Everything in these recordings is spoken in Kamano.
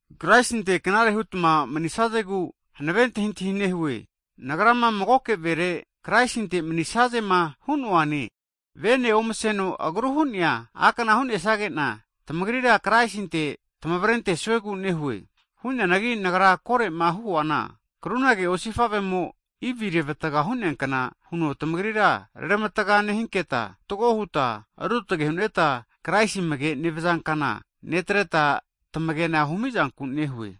Na'ankure Kraisinte knare hutma manisazegu hankave antahintahi nehue. Nagrama magoke vere, Kraisinte manisazema hu'noane. Vene omaseno agru hu'nea a'kna hu'nesage'na, tamagrira Kraisinte tamavrentesuegu nehue. Hu'neanagi nagra kore'ma huana, krunage osifavemo Ivi revatga hu'neakna huno tamagrira, reramataga nehinketa fatgo huta, ruotge hu'neta Kraisi amage nevaza kana netreta tamagena humizanku nehue.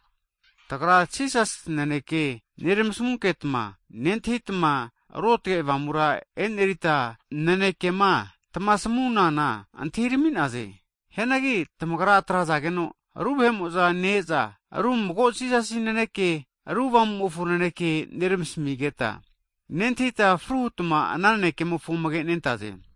Tagra Jisasi naneke nermasamunketma nentahitma, Ruotge Avamura e'nerita nanekema tamasamunana antahirami'naze. Hianagi tamagra atrazageno ru vahe'mo'za ne-eza, ru mago Jisasi nanekene, ru Avamumofo nanekea nermasamizageta, nentahita fru hutma ana nanekemofo amage nentaze.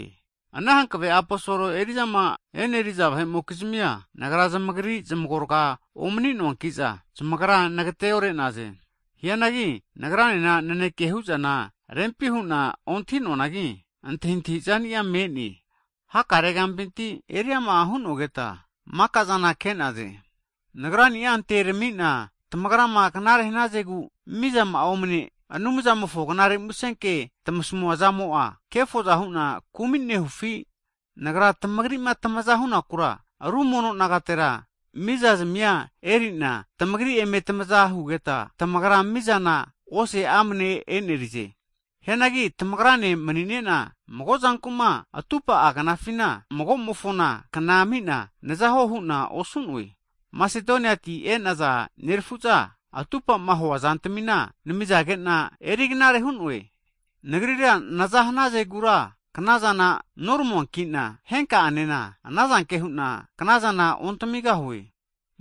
Ana hankave aposol eri'zama e'neriza vahe'mokizmia, nagra zamagri zmagorga'a omani'noankiza, zamagra nagateore'naze. Hianagi nagranena naneke hu'zana rempi hu'na ontahi'noanagi, antahintahi zania me'ne. Hakare kampinti, eriama hu'nonketa makazana ke'naze. Nagrania anteneramina, tamagrama knare hanazegu mizama'a omne Anumzamofo Knare Musenke tamasamua zamo'a, kefoza hu'na kumi nehufi? Nagra tamagri'ma tamaza hunakura musufa aseankna hu'na ru mono nagatetira musezazmia erina, tamagri eme tamaza hugeta, tamagra mizana ose amne e'nerize. Hagi tamagrane mani'nena magozankuma atupahua knafina, magomofona kna ami'na nazahuo hu'na osu'noe. Masedoniati e'naza nerafu'za, atupama huazantamina namizage'na eriknare hu'noe. Nagrira naza hanazegura knazana noramuankina, henka'anena anazanke hu'na knazana ontamigahue.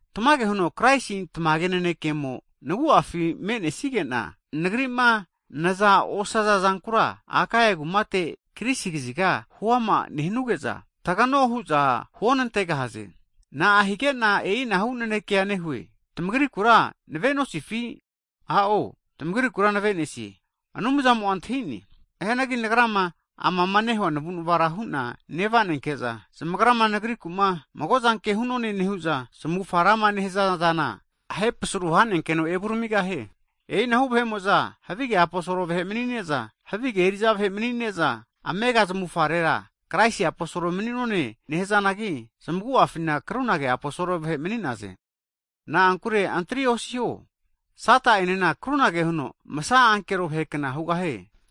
Tamage huno Kraisi tamage nanekemo nagu'afi me'nesigena, nagri'ma naza osazazankura Akaia kumate Grisi kaziga huama nehanuge'za, tagano hu'za huonantegahaze. Na'a hige'na e'inahu naneke nehue? Tamagrikura nave'nosifi? A'o tamagrikura navenesie, Anumzamo'a antahi'ne. Hianagi nagrama amama nehua navunavara hu'na nevanenke'za, zamagrama nagriku'ma mago'zanke hu'none nehu'za zamufga rama nehaza zana ahepasaru hanenkeno evuramigahie. E'inahu vahe'mo'za havige aposol vahe mani'ne'za, havige eri'za vahe mani'ne'za, amega zamufarera Kraisi aposol mani'none nehazanagi, zmagu'afina krunage aposol vahe mani'naze. Na'ankure antri osiho, Sata'enena krunage huno masa ankero vahe kna hugahie.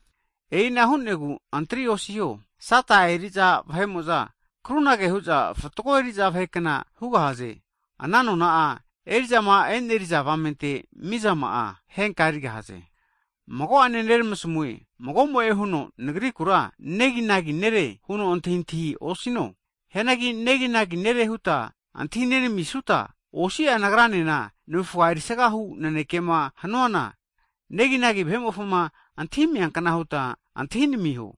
E'ina hu'negu antri osiho. Sata eri'za vahe'mo'za krunaza hu'za fatgo eri'za vahekna hugahaze. Ana nona'a eri'zama e'neri'za avamente mizama'a, henka'a erigahaze. Hagi mago'ane neramasmue, mago'mo'e huno nagrikura neginagi nere huno antahintahia osino. Hianagi neginagi nere huta antahinenamisuta, osi'a nagranena navufga erisagahu nanekema hanuana, neginagi vahe'mofoma antahimia kna huta antahinamiho.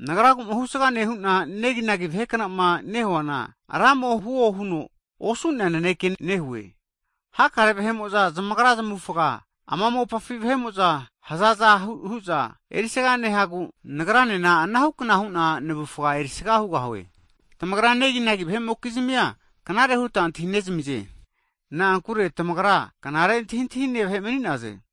Nagra'agu'ma husagama nehu'na, neginagi vahe knama nehuana, Ramo'a huo huno osu'nea naneke nehue. Hakare vahe'mo'za zamagra zamavufaga, ama mopafi vahe'mo'za hazaza hu'za erisaga nehagu, nagranena anahukna hu'na navufga erisaga hugahue. Tamagra neginagi vahe'mokizmia knare huta antahinezamize, na'ankure tamagra knare antahintahine vahe mani'naze.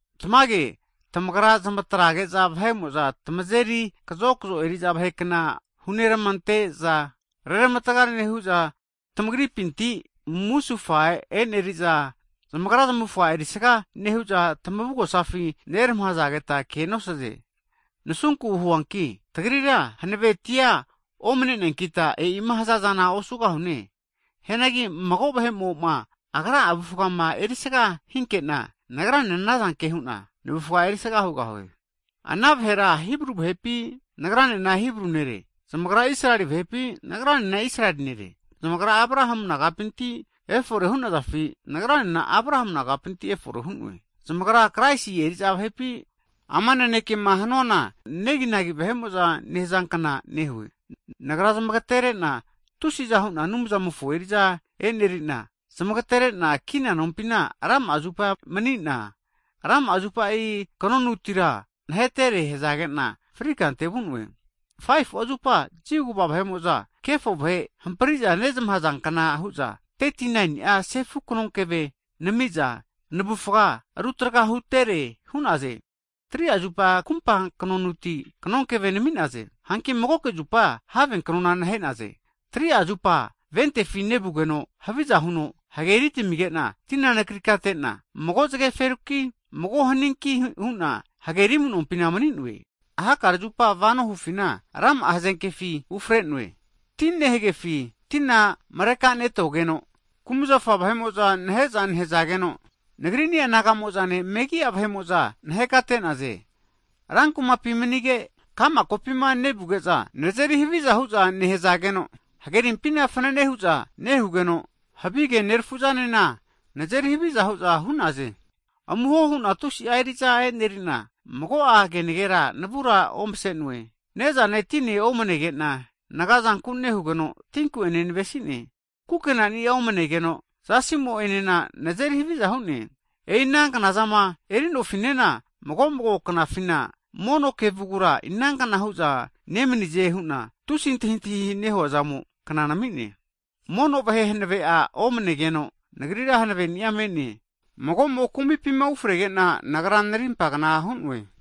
Tamage, tamagra zamatrazage'za vahe'mo'za tamazeri kazokzo eri'za vahe kna huneramante'za, reramatga nehu'za, tamagripinti'ma musufa e'neri'za, zamagra zamufga erisga nehu'za tamavugosafi neramahazageta kea nosaze. Nasunku huanki tagrira hanavetia omaneneankita e'ima hazazana osugahune! Hianagi mago vahe'mo'ma agra'a avufgama erisaga hinkena, nagranena anazanke hu'na navufga erisaga hugahue. Ana vahera Hibru vahepi? Nagranena Hibru nere. Zamagra Israeli vahepi? Nagranena Israeli nere. Zamagra Abrahamu nagapinti efore hunazafi? Nagranena Abrahamu nagapinti efore hu'noe. Zamagra Kraisi eriza vahepi? Ama nanekema hanuana neginagi vahe'mo'za nehazankna nehue. Nagra zamagterena tusiza hu'na Anumzamofo eri'za e'nerina, zamagterena kina nompina rama'a zupa manina, rama'a zupa kanonutira nahetere hazage'na frikante vu'noe. Hagi 5'a zupa, Jiu kva vahe'mo'za kefo vahe hampriza nezmahaza kna huza 39ni'a zupa sefu knonkeve namiza navufga rutraga hutere hu'naze. Hagi 3'a zupa kumpa knonuti knonkevea nami'naze. Hanki magoke zupa have knonu nahenaze. 3'a zupa ventefi nevugeno haviza huno hageri tamigena, tina nakrikatetena, mago zageferuki, mago haninki huna hageri amunompi mani'noe. Hakare zupama vanoma hufina, rama'a hazenkefi ufrenoe, ti nehegefi tina marekanetogeno, kumzafa vahe'mo'za nahe'za nehazageno, nagrini'a naga'mo'zane, megi'a vahe'mo'za nahekate'naze. Rankumapima manige, ka'ma kokampina nevuge'za nazeri haviza hu'za nehazageno, hagerimpima fanane hu'za nehugeno, havige nerafu'zanena nazeri haviza hu'za hu'naze. Amuho hu'na tusi'a eri'za e'neri'na, mago'a kenagera navura ovase'noe. Ne'zane tinena omanege'na nagazanku nehugeno, tinku'enena navesi'ne. Kukenani'a omanegeno zasimo'enena nazeri haviza hu'ne. E'i ana knazama eri'nofinena, mago mago knafina mono kevugura, inankna hu'za nemanize hu'na tusi antahiantahi nehuazamo'a kna nami'ne. Mono vahe hanave'a omanegeno'a, nagrira hankaveni'a omane'ne? Mago'mo'ma kumipima ufregena, nagra narimpa kna hu'noe.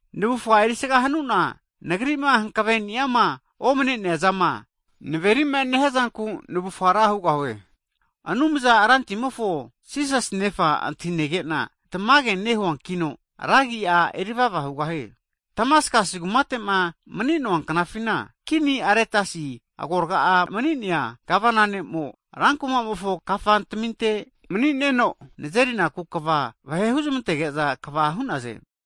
Navufga erisaga hanuna, nagrima hankaveniama omane'nea zama naveri'ma nehiazanku navufga ra hugahue. Anumzana Rantimofo Jisasi Nefa antahinege'na tamage nehuankino, ra agia erivava hugahie. Damaskasi kumate'ma mani'noa knafina, Kini ne' Aretasi agorga'a mani'nea gavana ne'mo, rankumamofo kafantaminte mani'neno nazerinaku kava vahe huzamantegeza kava hu'naze.